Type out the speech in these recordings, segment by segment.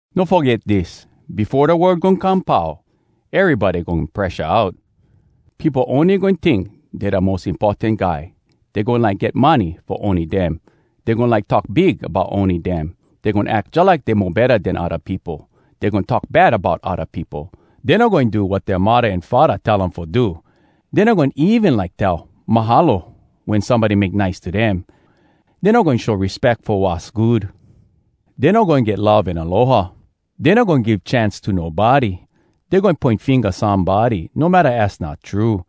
No foget dis: befo da world goin come pau, erybody goin presha out. Peopo ony goin tink dey da mos importan guy. Dey goin like get money fo ony dem. Dey goin like talk big bout ony dem. Dey goin ack jalike dey mo betta den da odda peopo. Dey goin talk bad bout odda peopo. Dey no goin do wat dea muddah an faddah tell um fo do. Dey no goin even like tell “Mahalo” wen somebody make nice to dem. Dey no goin show respeck fo wass good. Dey no goin get love an aloha. Dey no goin give chance to nobody. Dey goin poin finga somebody, no matta az not true.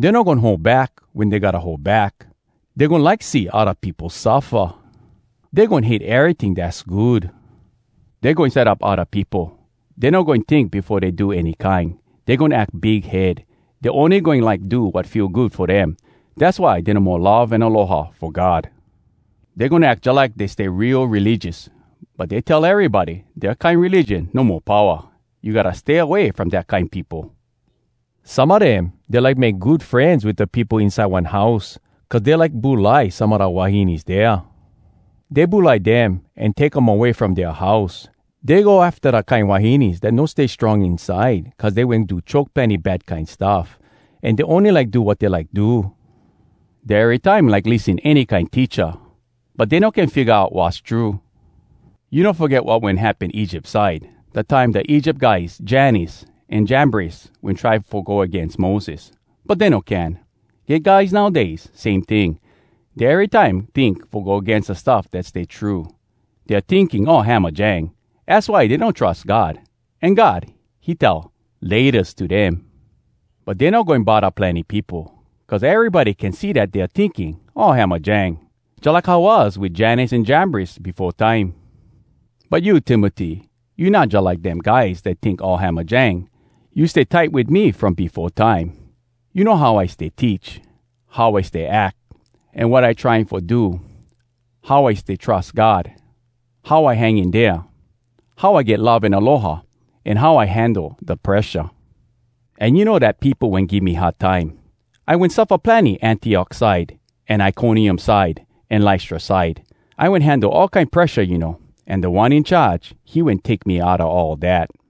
Dey no goin hold back wen dey gotta hold back. Dey goin like see odda peopo suffa. Dey goin hate eryting dass good. Dey goin set up odda peopo. Dey no goin tink befo dey do any kine. Dey goin ack big head. Dey ony goin like do wat feel good fo dem. Dass why dey no mo love an aloha fo God. Dey goin ack jalike dey stay real religious, but dey tell erybody dea kine religion no mo powa. You gotta stay away from dat kine peopo. Some a dem, dey like make good frenz wit da peopo inside one house, cuz dey like bulai some a da wahines dea. Dey bulai dem an take um away from dea house. Dey go afta da kine wahines dat no stay strong inside cuz dey wen do choke plenny bad kine stuff, an dey ony like do wat dey like do. Dey erytime like lissen any kine teacha, but dey no can figga out wass true. You no foget wat wen happen Egypt side, dat time da Egypt guys Jannes an Jambres wen try fo go agains Moses, but dey no can? Get guys nowdays, same ting—dey erytime tink fo go agains da stuff dat stay true. Dea tinking all hamajang. Az why dey no trus God, an God, he tell “Laytas” to dem. But dey no goin bodda plenny peopo—cuz erybody can see dat dea tinking all hamajang. Jalike how was wit Jannes an Jambres befo time. But you, Timoty, you not jalike dem guys dat tink all hamajang. You stay tight wit me from befo time. You know how I stay teach, how I stay ack, an wat I trying fo do, how I stay trus God, how I hang in dea, how I get love an aloha, an how I handle da presha. An you know dat peopo wen give me hard time. I wen suffa plenny Antiok side, an Iconium side, an Lystra side. I wen handle all kine presha, you know, an Da One In Charge, he wen take me outa all dat.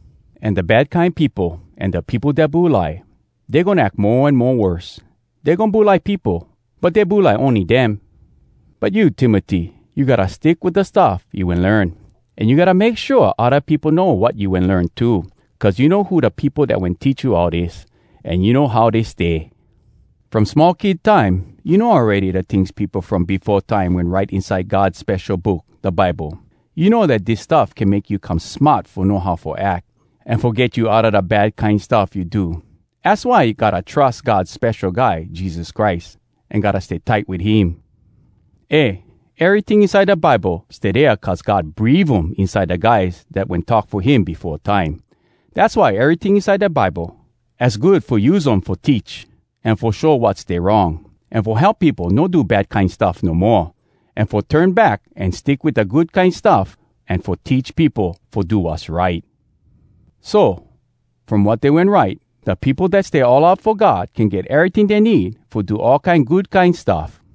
An da bad kine peopo, an da peopo dat bulai, dey goin ack mo an mo worse. Dey goin bulai peopo, but dey bulai ony dem! But you, Timoty, you gotta stick wit da stuff you wen learn, an you gotta make shua odda peopo know wat you wen learn too. Cuz you know who da peopo dat wen teach you all dis, an you know how dey stay. From small kid time, you know awready da tings da peopo from befo time wen write inside God Spesho Book, da Bible. You know dat dis stuff can make you come smart fo know how fo ack, an fo get you outa da bad kine stuff you do. Az why gotta trus God Spesho Guy Jesus Christ, an gotta stay tight wit him. Eh, eryting inside da Bible stay dea cuz God breave um inside da guys dat wen talk fo him befo time. Dass why eryting inside da Bible, az good fo use um fo teach, an fo show wat stay wrong, an fo help peopo no do da bad kine stuff no moa, an fo turn back an stick wit da good kine stuff, an fo teach peopo fo do wass right. So from wat dey wen write, da peopo dat stay all out fo God can get eryting dey need fo do all kine good kine stuff.